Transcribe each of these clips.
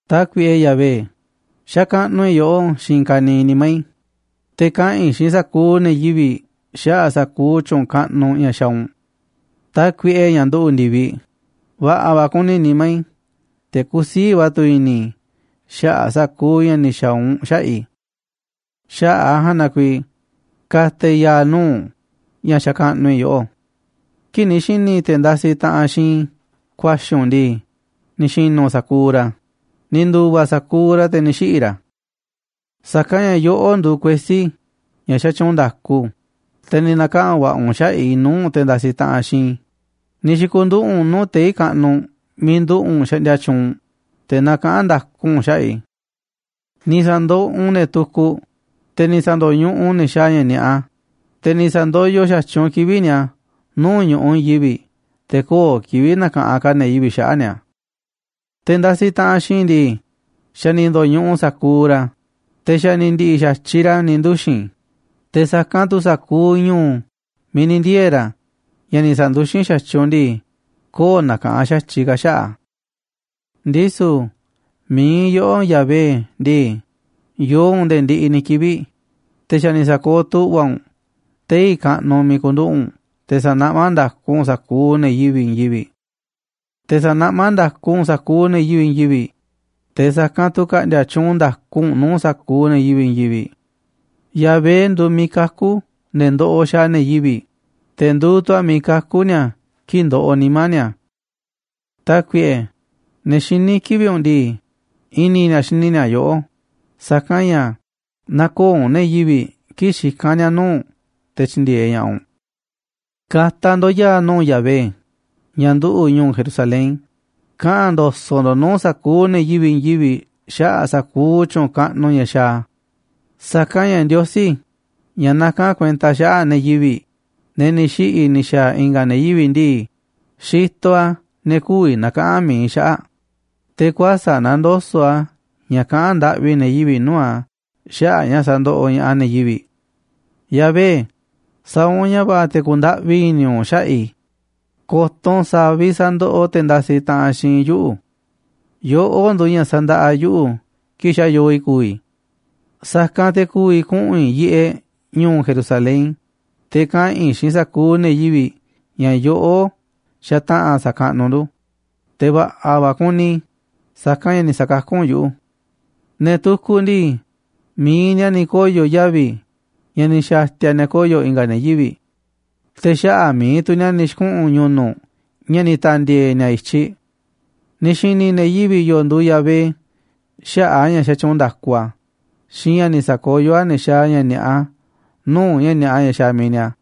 Tákuiꞌe Yahvé, xakaꞌnuꞌ i̱ yoꞌó xiinꞌ i̱i̱n ka̱niiꞌ nimá i̱, te̱ kaꞌa̱n i̱ xiinꞌ sa̱kuuꞌ ne̱ yivi̱ꞌ xaꞌa̱ꞌ sa̱kuuꞌ tyu̱u̱n kaꞌnuꞌ ña̱ xaaꞌ u̱nꞌ. Tákuiꞌe, ña̱ nduꞌu̱ꞌ ndi̱viꞌ, va̱ꞌa̱ va̱ kuni nimá i̱, te̱ kusiíꞌ va̱ tu̱ i̱ni̱ i̱ xaꞌa̱ꞌ sa̱kuuꞌ ña̱ ni̱ xa̱a̱ u̱nꞌ xaꞌa̱ꞌ i̱. Xaꞌa̱ꞌ a̱ ja̱a̱nꞌ na kuiiꞌ ka̱ta̱ i̱ ya̱a̱ nuu̱ꞌ u̱nꞌ, ña̱ xakaꞌnuꞌ i̱ yoꞌó. Kii̱ꞌ ni̱ xi̱ni̱ te̱ ndasiꞌ taꞌanꞌ xiinꞌ i̱ ku̱a̱xi̱ u̱nꞌ ndii, ni̱ xi̱nu̱ sa̱kuuꞌ ra̱, ni̱ ndu̱va̱ sa̱kuuꞌ ra̱, te̱ ni̱ xiꞌi̱ ra̱. Sa̱kanꞌ ña̱ yoꞌó nduuꞌ kuesí, ña̱ xatyuunꞌ nda̱ku, te̱ ni̱ na̱kaꞌa̱n va̱ꞌa̱ u̱nꞌ xaꞌa̱ꞌ i̱ nuu̱ꞌ te̱ ndasiꞌ taꞌanꞌ xiinꞌ i̱, ni̱ xi̱ku̱nduꞌu̱ꞌ u̱nꞌ nuu̱ꞌ tei̱ kaꞌnuꞌ miiꞌ nduꞌu̱ꞌ u̱nꞌ xaꞌndia tyuunꞌ u̱nꞌ, te̱ nakaꞌán nda̱ku u̱nꞌ xaꞌa̱ꞌ i̱. Ni̱ sa̱ndoꞌoꞌ u̱nꞌ ne̱ tukuꞌ, te̱ ni̱ sa̱ndo̱ñuꞌuꞌ u̱nꞌ ne̱ xaaꞌ ña̱ ni̱a̱ꞌa, te̱ ni̱ sa̱ndoyoꞌ xa̱tyiꞌ u̱nꞌ kivi̱ꞌ ni̱a̱ nuu̱ꞌ ñu̱ꞌuꞌ i̱i̱n yivi̱ꞌ, te̱ köo̱ꞌ kivi̱ꞌ na̱ka̱ꞌanꞌ ka̱ ne̱ yivi̱ꞌ xaꞌa̱ꞌ ni̱a̱. Te̱ ndasiꞌ taꞌanꞌ xiinꞌ i̱ ndii, xa̱ ni̱ ndo̱ñuꞌuꞌ sa̱kuuꞌ ra̱, te̱ xa̱ ni̱ ndi̱ꞌi̱ xa̱tyiꞌ ra̱ ni̱ nduxi̱n, te̱ sa̱kanꞌ tu̱ sa̱kuuꞌ ñu̱u̱ miiꞌ ni̱ ndiee̱ ra̱, ña̱ ni̱ sa̱nduxín xa̱tyiꞌ u̱nꞌ ndii, köo̱ꞌ nakaꞌanꞌ xa̱tyiꞌ ka̱ xaꞌa̱ꞌ a̱. Ndisu̱ mi̱iꞌ yoꞌó, Yahvé ndii, yoo u̱nꞌ nde̱e̱ ndiꞌiꞌ ni̱ kivi̱ꞌ, te̱ xa̱ ni̱ sa̱kooꞌ tu̱ꞌva̱ u̱nꞌ tei̱ kaꞌnuꞌ miiꞌ ku̱nduꞌu̱ꞌ u̱nꞌ te̱ sa̱naꞌmá nda̱ku u̱nꞌ sa̱kuuꞌ ne̱ yivi̱ꞌ i̱i̱n yivi̱ꞌ. Te̱ sa̱naꞌmá nda̱ku u̱nꞌ sa̱kuuꞌ ne̱ yivi̱ꞌ i̱i̱n yivi̱ꞌ, te̱ sa̱kanꞌ tu̱ ka̱ꞌndi̱a̱ tyuunꞌ nda̱ku u̱nꞌ nuu̱ꞌ sa̱kuuꞌ ne̱ yivi̱ꞌ i̱i̱n yivi̱ꞌ. Yahvé nduuꞌ miiꞌ kakú ne̱ ndoꞌoꞌ xaaꞌ ne̱ yivi̱ꞌ, te̱ nduuꞌ tu̱ a̱ miiꞌ kakú ni̱a̱ kii̱ꞌ ndoꞌoꞌ nimá ni̱a̱. Tákuiꞌe, ne̱ xiní kivi̱ꞌ u̱nꞌ ndii, i̱ni̱ ni̱a̱ xini ni̱a̱ yoꞌó, sa̱kanꞌ ña̱ näkooꞌ u̱nꞌ ne̱ yivi̱ꞌ kii̱ꞌ xikán ni̱a̱ nuu̱ꞌ u̱nꞌ te̱ tyi̱ndi̱e̱eꞌ ña̱ꞌaꞌ u̱nꞌ. Ka̱ta̱ ndo̱ꞌ ya̱a̱ nuu̱ꞌ Yahvé ña̱ nduꞌu̱ꞌ ñu̱u̱ Jerusalén, kaꞌa̱n ndo̱so̱ꞌ ndo̱ꞌ nuu̱ꞌ sa̱kuuꞌ ne̱ yivi̱ꞌ i̱i̱n yivi̱ꞌ xaꞌa̱ꞌ sa̱kuuꞌ tyu̱u̱n kaꞌnuꞌ ña̱ xaaꞌ a̱. Sa̱kanꞌ ña̱ Ndiosí, ña̱ nakán kuenta xaꞌa̱ꞌ ne̱ yivi̱ꞌ, ne̱ ni̱ xiꞌi̱ ni̱ xa̱a̱ i̱nga̱ ne̱ yivi̱ꞌ ndii, xitoꞌ a̱ ne̱ kü̱vi̱ na̱kaꞌa̱n mi̱iꞌ xaꞌa̱ꞌ, te̱ kuäsa̱ꞌ nandoso̱ꞌ a̱ ña̱ kaꞌán ndaꞌvi ne̱ yivi̱ꞌ nuu̱ꞌ a̱ xaꞌa̱ꞌ ña̱ sandoꞌoꞌ ña̱ꞌaꞌ ne̱ yivi̱ꞌ. Yahvé, sa̱a̱ u̱nꞌ ña̱ va̱ꞌa̱ te̱ ku̱ndaꞌvi i̱ni̱ u̱nꞌ xaꞌa̱ꞌ i̱, ko̱to̱ u̱nꞌ sa̱a̱ vi̱ꞌ sandoꞌoꞌ te̱ ndasiꞌ taꞌanꞌ xiinꞌ i̱ yuꞌu̱. Yoꞌó nduuꞌ ña̱ sa̱ndaꞌa yuꞌu̱ kii̱ꞌ xa̱ yoo i̱ ku̱vi̱ i̱. Sa̱kanꞌ te̱ ku̱vi̱ kuꞌu̱n i̱ yiꞌeꞌ ñu̱u̱ Jerusalén, te̱ kaꞌa̱n i̱ xiinꞌ sa̱kuuꞌ ne̱ yivi̱ꞌ ña̱ yoꞌó xataꞌa̱n sa̱kaꞌnuꞌ ndu̱, te̱ va̱ꞌa̱ va̱ kuni i̱, sa̱kanꞌ ña̱ ni̱ sa̱kakú u̱nꞌ yuꞌu̱. Ne̱ tukuꞌ ndii, mi̱iꞌ ni̱a̱ ni̱ koyo̱ yavi̱ ña̱ ni̱ xa̱ti̱a̱ ni̱a̱ koyo̱ i̱nga̱ ne̱ yivi̱ꞌ, te̱ xaꞌa̱ꞌ mi̱iꞌ tu̱ ni̱a̱ ni̱ xi̱kuꞌu̱n ñu̱nu̱ꞌ ña̱ ni̱ ta̱ndi̱e̱e̱ ni̱a̱ i̱tyiꞌ. Ni̱ xi̱ni̱ ne̱ yivi̱ꞌ yoo nduuꞌ Yahvé xaꞌa̱ꞌ a̱ ña̱ xatyuunꞌ nda̱ku a̱ xiinꞌ ña̱ ni̱ sa̱koyó a̱ ne̱ xaaꞌ ña̱ ni̱a̱ꞌa nuu̱ꞌ ña̱ ni̱a̱ꞌa ña̱ xaaꞌ mi̱iꞌ ni̱a̱.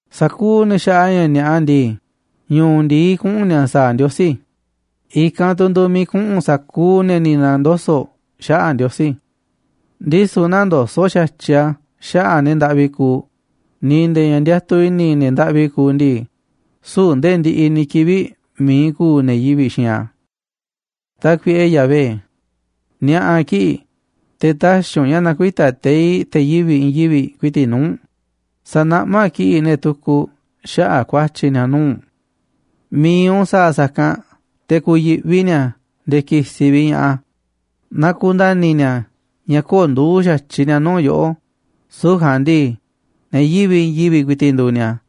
Sa̱kuuꞌ ne̱ xaaꞌ ña̱ ni̱a̱ꞌa ndii, ñu̱u̱ ndi̱i kuꞌu̱n ni̱a̱ sa̱a̱ Ndiosí, i̱kanꞌ tu̱ nduuꞌ miiꞌ kuꞌu̱n sa̱kuuꞌ ne̱ ni̱ na̱ndoso̱ꞌ xaꞌa̱ꞌ Ndiosí. Ndisu̱ nä̱ndoso̱ꞌ xa̱tyiꞌ a̱ xaꞌa̱ꞌ ne̱ ndaꞌvi kuuꞌ, ni̱ nde̱e̱ ña̱ ndiatuꞌ i̱ni̱ ne̱ ndaꞌvi kuuꞌ ndii, süu̱ꞌ ndee ndiꞌiꞌ ni̱ kivi̱ꞌ mi̱iꞌ ku̱u̱ ne̱ yivi̱ꞌ xiinꞌ a̱. Tákuiꞌe Yahvé, ni̱a̱ꞌa̱ kiꞌi̱ꞌ, te̱ tä̱xi̱ u̱nꞌ ña̱ na̱kuita̱ teiꞌ te̱ yivi̱ꞌ i̱i̱n yivi̱ꞌ ku̱i̱ti̱ꞌ nuu̱ꞌ u̱nꞌ, sa̱naꞌmá kiꞌi̱ꞌ ne̱ tukuꞌ xaꞌa̱ꞌ ku̱a̱tyi̱ ni̱a̱ nuu̱ꞌ u̱nꞌ. Mi̱iꞌ u̱nꞌ sa̱a̱ sa̱kanꞌ te̱ ku̱yi̱ꞌvi ni̱a̱ nde̱e̱ ki̱si̱ vi̱ꞌ ña̱ꞌaꞌ a̱, na ku̱nda̱ni̱ ni̱a̱ ña̱ köo̱ꞌ nduuꞌ xa̱tyiꞌ ni̱a̱ nuu̱ꞌ yoꞌó, süu̱ꞌ ja̱a̱nꞌ ndii, ne̱ yivi̱ꞌ i̱i̱n yivi̱ꞌ ku̱i̱ti̱ꞌ nduuꞌ ni̱a̱.